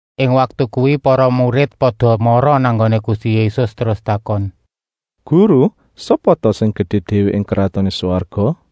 Ing waktu kuwi para murid pada mara nang nggoné Gusti Yésus terus takon: “Guru, sapa ta sing gedé déwé ing Kratoné Swarga?”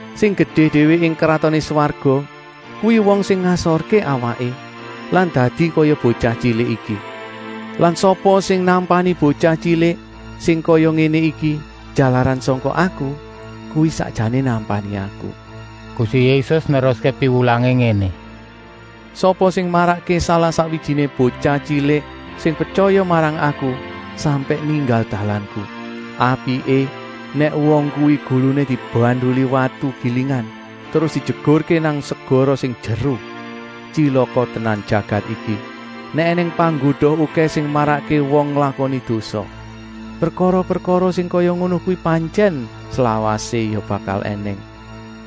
Sing gedé déwé ing Kratoné Swarga kuwi wong sing ngasorké awaké lan dadi kaya botyah tyilik iki. Lan sapa sing nampani botyah tyilik sing kaya ngéné iki jalaran sangka Aku, kuwi sakjané nampani Aku.” Gusti Yésus neruské piwulangé ngéné: “Sapa sing marakké salah-sakwijiné botyah tyilik sing pretyaya marang Aku sampèk ninggal dalanku, apiké nèk wong kuwi guluné dibanduli watu gilingan terus dijegurké nang segara sing jeru. Tyilaka tenan jagat iki, nèk ènèng panggoda okèh sing marakké wong nglakoni dosa. Prekara-prekara sing kaya ngono kuwi pantyèn slawasé ya bakal ènèng,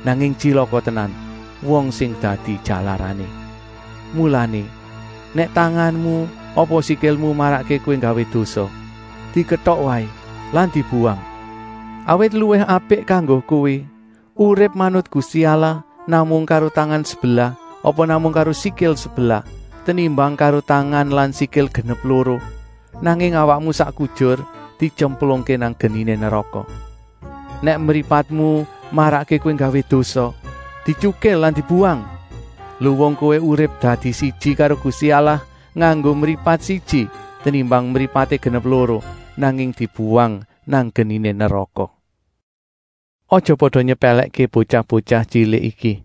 nanging tyilaka tenan, wong sing dadi jalarané. “Mulané, nèk tanganmu apa sikilmu marakké kowé nggawé dosa, diketok waé lan dibuwang. Awit luwih apik kanggo kowé urip manut Gusti Allah namung karo tangan sebelah apa namung karo sikil sebelah, tenimbang karo tangan lan sikil genep loro, nanging awakmu sak kujur dityemplungké nang geniné neraka. Nèk mripatmu marakké kowé nggawé dosa, dityukil lan dibuwang. Luwung kowé urip dadi siji karo Gusti Allah nganggo mripat siji, tenimbang mripaté genep loro, nanging dibuwang nang geniné neraka. “Aja pada nyepèlèkké botyah-botyah tyilik iki.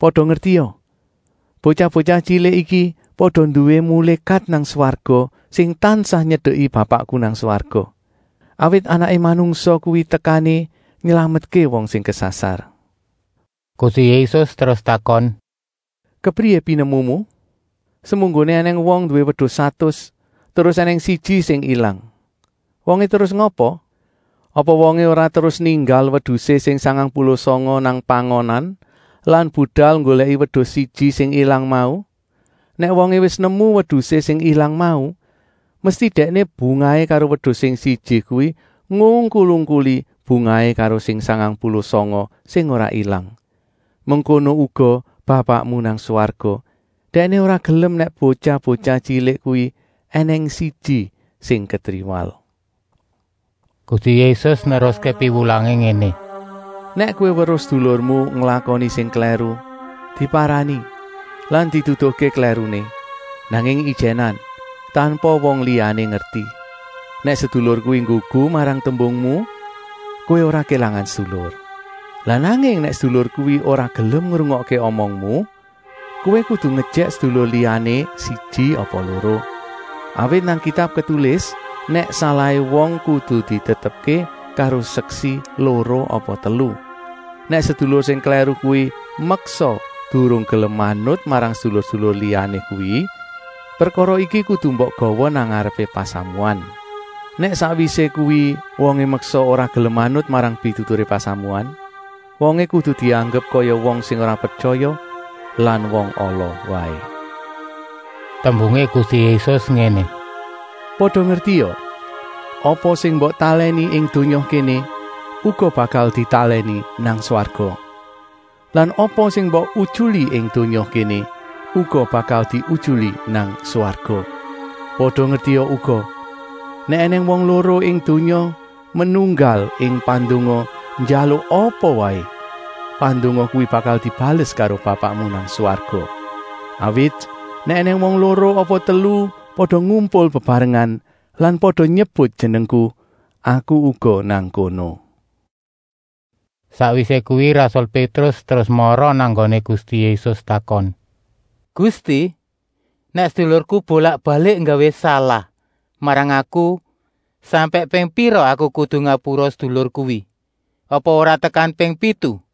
Pada ngertia, botyah-botyah tyilik iki pada nduwé mulékat nang swarga sing tansah nyedeki Bapakku nang swarga. ( Awit Anaké Manungsa kuwi tekané nylametké wong sing kesasar.)” Gusti Yésus terus takon: “Kepriyé pinemumu? Semunggoné ènèng wong nduwé wedus satus terus ènèng siji sing ilang. Wongé terus ngapa? Apa wongé ora terus ninggal wedusé sing sangang puluh sanga nang pangonan lan budal nggolèki wedus siji sing ilang mau? Nèk wongé wis nemu wedusé sing ilang mau, mesti dèkné bungahé karo wedus sing siji kuwi ngungkul-ungkuli bungahé karo sing sangang puluh sanga sing ora ilang. Mengkono uga Bapakmu nang swarga, Dèkné ora gelem nèk botyah-botyah tyilik kuwi ènèng siji sing ketriwal.” Gusti Yésus neruské piwulangé ngéné: “Nèk kowé weruh sedulurmu nglakoni sing klèru, diparani lan diduduhké klèruné, nanging ijènan, tanpa wong liyané ngerti. Nèk sedulur kuwi nggugu marang tembungmu, kowé ora kélangan sedulur. Lah nanging nèk sedulur kuwi ora gelem ngrungokké omongmu, kowé kudu ngejèk sedulur liyané siji apa loro. Awit nang Kitab ketulis nèk salahé wong kudu ditetepké karo seksi loro apa telu. Nèk sedulur sing klèru kuwi meksa durung gelem manut marang sedulur-sedulur liyané kuwi, prekara iki kudu mbok gawa nang ngarepé pasamuan. Nèk sakwisé kuwi wongé meksa ora gelem manut marang pituturé pasamuan, wongé kudu dianggep kaya wong sing ora pretyaya lan wong ala waé.” Tembungé Gusti Yésus ngéné: “Pada ngertia! Apa sing mbok talèni ing donya kéné uga bakal ditalèni nang swarga. Lan apa sing mbok utyuli ing donya kéné uga bakal diutyuli nang swarga. “Pada ngertia uga! Nèk ènèng wong loro ing donya menunggal ing pandonga njaluk apa waé, pandonga kuwi bakal dibales karo Bapakmu nang swarga. Awit nèk ènèng wong loro apa telu pada ngumpul bebarengan lan pada nyebut Jenengku, Aku uga nang kono.” Sakwisé kuwi rasul Pétrus terus mara nang nggoné Gusti Yésus takon: “Gusti, nèk sedulurku bolak-balik nggawé salah marang aku, sampèk ping pira aku kudu ngapura sedulur kuwi? Apa ora tekan ping pitu?”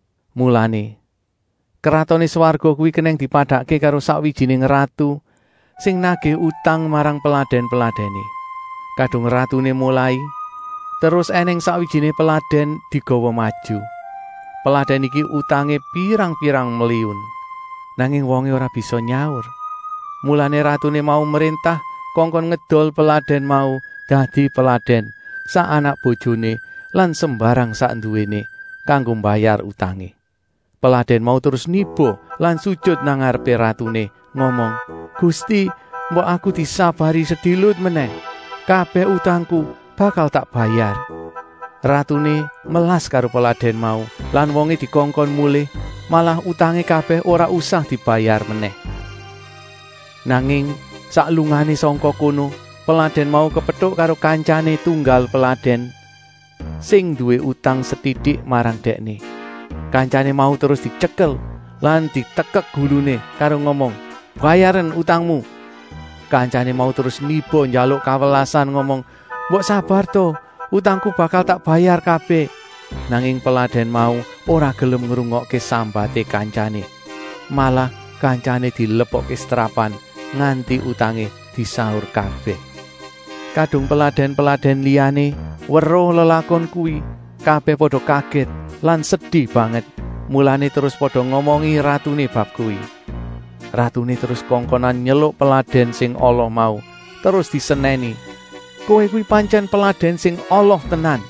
Mulané, Kratoné Swarga kuwi kenèng dipadakké karo sakwijiné ratu sing nagih utang marang peladèn-peladèné. Kadung ratuné molai, terus ènèng sakwijiné peladèn digawa maju. Peladèn iki utangé pirang-pirang mliyun. Nanging wongé ora bisa nyaur, mulané ratuné mau mréntah kongkon ngedol peladèn mau dadi peladèn, sak anak-bojoné lan sembarang sak nduwéné, kanggo mbayar utangé. Peladèn mau terus niba lan sujut nang ngarepé ratuné ngomong: ‘Gusti, mbok aku disabari sedilut menèh. Kabèh utangku bakal tak bayar.’ Ratuné melas karo peladèn mau lan wongé dikongkon mulih, malah utangé kabèh ora usah dibayar menèh. “Nanging sak lungané sangka kono, peladèn mau kepetuk karo kantyané tunggal peladèn, sing nduwé utang setitik marang dèkné. Kantyané mau terus dityekel lan ditekek guluné karo ngomong: ‘Bayaren utangmu!’ Kantyané mau terus niba njaluk kawelasan ngomong: ‘Mbok sabar ta! Utangku bakal tak bayar kabèh!’ Nanging peladèn mau ora gelem ngrungokké sambaté kantyané. Malah kantyané dilebokké setrapan nganti utangé disaur kabèh. Kadung peladèn-peladèn liyané weruh lelakon kuwi, kabèh pada kagèt lan sedi banget, mulané terus pada ngomongi ratuné bab kuwi. Ratuné terus kongkonan nyeluk peladèn sing ala mau terus disenèni: ‘Kowé kuwi pantyèn peladèn sing ala tenan.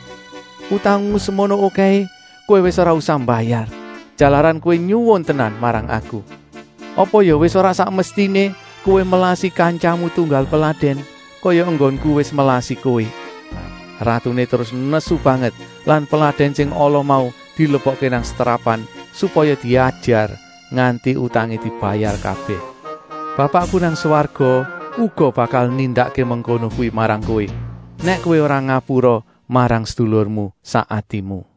Utangmu semono okèhé kowé wis ora usah mbayar, jalaran kowé nyuwun tenan marang aku. Apa ya wis ora sak mestiné kowé melasi kantyamu tunggal peladèn, kaya enggonku wis melasi kowé.’ Ratuné terus nesu banget lan peladèn sing ala mau dilebokké nang setrapan supaya diajar, nganti utangé dibayar kabèh. “Bapakku nang swarga uga bakal nindakké mengkono kuwi marang kowé, nèk kowé ora ngapura marang sedulurmu sak atimu.”